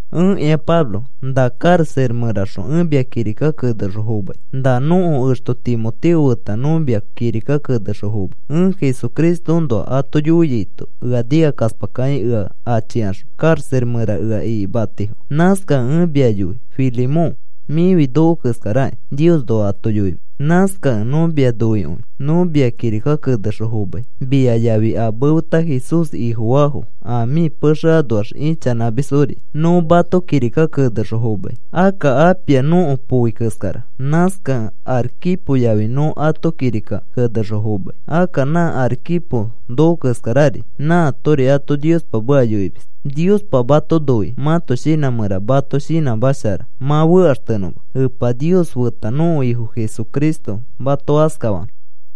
Ẽkĩa Pablo. Na karaxa mẽraxõ ẽ mia kirika kenexõ fomai. Na nõko exto Timoteo feta nõ mia kirika kenexõ fomai. Ẽ Jesucristoõnoa ato yoiaito, ea nikakaspakakĩ ea achikaxõ karaxa mẽra ea ikimatifo. Nãskakẽ ẽ mia yoi, Filemón, mĩfi noko keskarakĩ Niosnoa ato yoimis. Nãskakẽ nõ mia noikõi. Nõ mia kirika kenexõ fomai, mia yafi a mefeta Jesús Ifofaafo a mĩ pexe anoax ichanãmisfori nõ mato kirika kenexõ fomai. Akka Apia nõko poi keskara, nãskakẽ Arquipo yafi nõ ato kirika kenexõ fomai. Akka nã Arquipo noko keskarari nãatori ato Niospa meka yoimis. Niospa mato noikĩ mãto shinã mẽra mato shinãmashara mã fekaxtenõma. Epa Nios feta nõko Ifo Jesucristo mato askafanõ.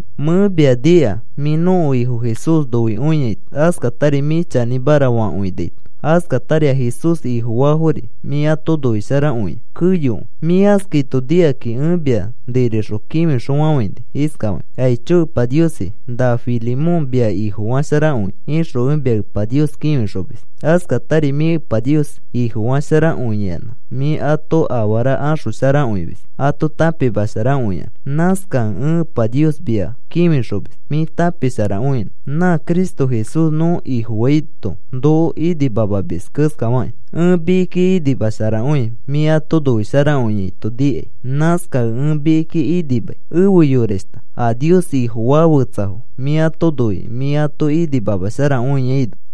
Mẽ mia nika mĩ nõko Ifo Jesús noikõiaito, askatari mĩ chanĩmara fakõinaito, askatari a Jesús Ifofaafori mĩ ato noisharakõia keyokõi. Mĩ askaito nikakĩ ẽ mia nirixõ kĩfixõfafãini iskafakĩ: “Aicho Epa Niosi, na Filemón mia Ifofasharakõia,” ixõ ẽ mia Epa Nios kĩfixomis. Askatari mĩ Epa Nios Ifofasharakõiyanã mĩ ato afara axosharakõimis ato tãpimasharakõiyanã. Nãskakẽ ẽ Epa Nios mia kĩfixomis mĩ tãpisharakõinõ nã Cristo Jesús nõ Ifofaito noko inimamamis keskafakĩ. Ẽ mikiki inimasharakõi mĩ ato noisharakõiaito nikai. Nãskakẽ ẽ mikiki inimai, efe yorashta, a Nios Ifofaa fetsafo mĩ ato noikĩ mĩ ato inimamasharakõiaino.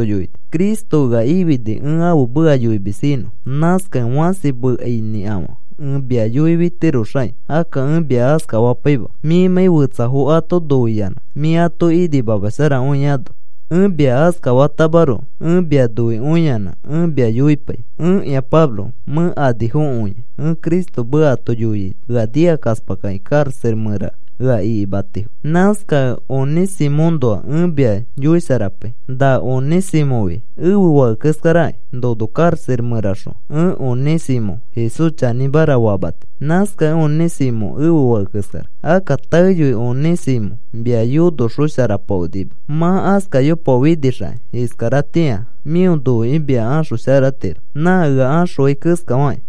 Cristo ea ifini ẽ ãfe meka yoimis inõ. Nãskakẽ fãsi mekainĩkafã ẽ mia yoifitiroxakĩ, akka ẽ mia askafapaima mĩmãi fetsafo ato noiyanã mĩ ato inimamasharakõiano. Ẽ mia askafatamaroko ẽ mia noikõiyanã ẽ mia yoipai. Ẽkĩa Pablo mẽ anifokõia ẽ Cristo meka ato yoiaito ea nikakaspakakĩ karaxa mẽra ea ikimatifo. Nãskakẽ Onĩsimõõnoa ẽ mia yoisharapai. Na Onĩsimõfi ẽfe fake keskaraki. Nono karaxa mẽraxõ ẽ Onĩsimõ Jesús chanĩmara famati. Nãskakẽ Onĩsimõ ẽfe fake keskara. Akka taeyoi Onĩsimõ mia yonoxosharapaonima. Mã askayopaofinixakĩ, iskaratĩa mĩo noikĩ mia axosharatiro, nã ea axõai keskafakĩ.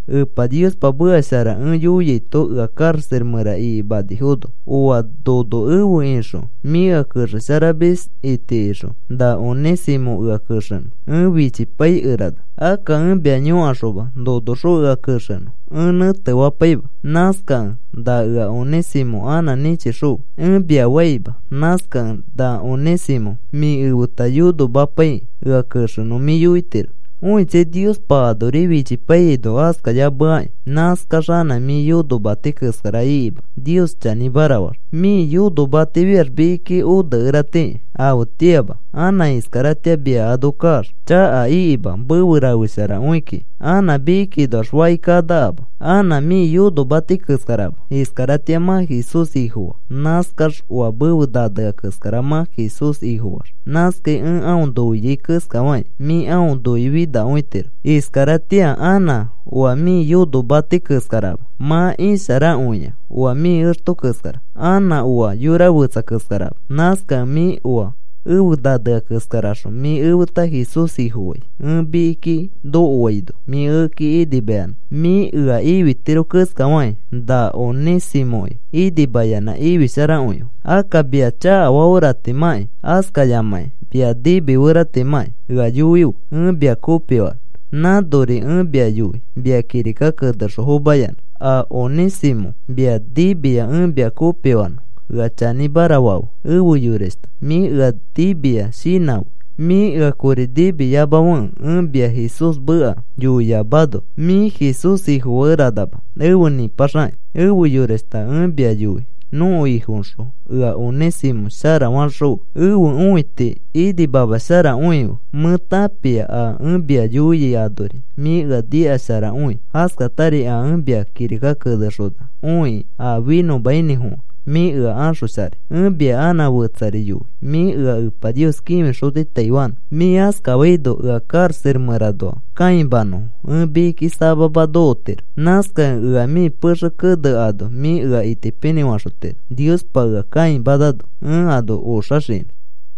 Epa Niospa meka shara ẽ yoiaito ea karaxa mẽra ikimanifono, oa nono efe ixõ mĩ ea kexesharamis itikixõ na Onĩsimõ ea kexenõ ẽ fichipaikerana. Akka ẽ mia yõkaxoma nonoxõ ea kexenõ, ẽ nẽtefapaima. Nãskakẽ, “Na ea Onĩsimõ anã nĩchixõfe,” ẽ mia faima. Nãskakẽ na Onĩsimõ mĩ efeta yonomapaikĩ ea kexenõ mĩ yoitiro. Õitsai, Niospa anori fichipaiyaino askayameaki nãskax anã mĩ yonomati keskara ikima Nios chanĩmara faax. Mĩ yonomatifiax mikiki onekeratiki afetĩama. Anã iskaratĩa mia ano kaax, chaka ikima mefe rafesharakõi kiki. Anã mikikinoax faki kanakama. Anã mĩ yonomati keskarama. Iskaratĩa mã Jesús Ifofaa. Nãskax oa mefe nanea keskara mã Jesús Ifofaax. Nãskai ẽ aõ noiai keskafakĩ, mĩ aõ noifinakõitiro. Iskaratĩa anã oa mĩ yonomati keskarama. Mã isharakõia oa mĩ exto keskara, anã oa yora fetsa keskarama. Nãskakẽ mĩ oa efe nanea keskaraxõ mĩ efeta Jesús Ifofai, ẽ mikiki nokoaino mĩ ekeki inimayanã mĩ ea ifitiro keskafakĩ, na Onĩsimõki inimayanã ifisharakõife. Akka mia chakafaferatimãkĩ, askayamãkĩ mia nimiferatimãkĩ ea yoife ẽ mia kopifanõ. Nãnori ẽ mia yoi mia kirika kenexõ fomayanã. A Onĩsimõ mia nimia ẽ mia kopifanõ ea chanĩmara fafe. Efe yorashta, mĩ ea nimia shinãfe. Mĩ ea kori nimiyamafekẽ ẽ mia Jesús meka yoiyamano mĩ Jesús Ifofakeranama afe nĩpaxakĩ. Efe yorashta, ẽ mia yoi nõko Ifoõxõ ea Onĩsimõ shara faxõfe. Ẽfe õiti inimamasharakõife. Mẽ tãpia a ẽ mia yoiai anori mĩ ea nikasharakõi. Askatari a ẽ mia kirika kenexona õikĩ a finõmainĩfofã mĩ ea axosharai. Ẽ mia anã fetsari yoi. Mĩ ea Epa Nios kĩfixotitaifanõ. Mĩ askafaino ea karaxa mẽranoa kãimanafono ẽ mikiki samama nokotiro. Nãskakẽ ea mĩ pexe kene ano mĩ ea itipinĩ faxotiro, Niospa ea kãimanano ẽ ano oxaxinõ.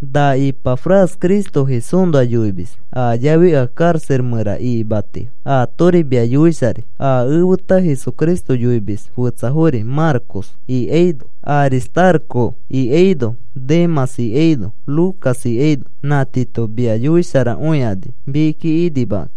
Na Ipafras Cristo Jesúsnoa yoimis a yafi ea karaxa mẽra ikimatifo, aatori mia yoisharai. A efeta Jesucristo yoimis, fetsafori Marcos ikaino, Aristaroco ikaino, Demãs ikaino, Lucas ikaino, nã tiito mia yoisharakõikani mikiki inimakãkĩ.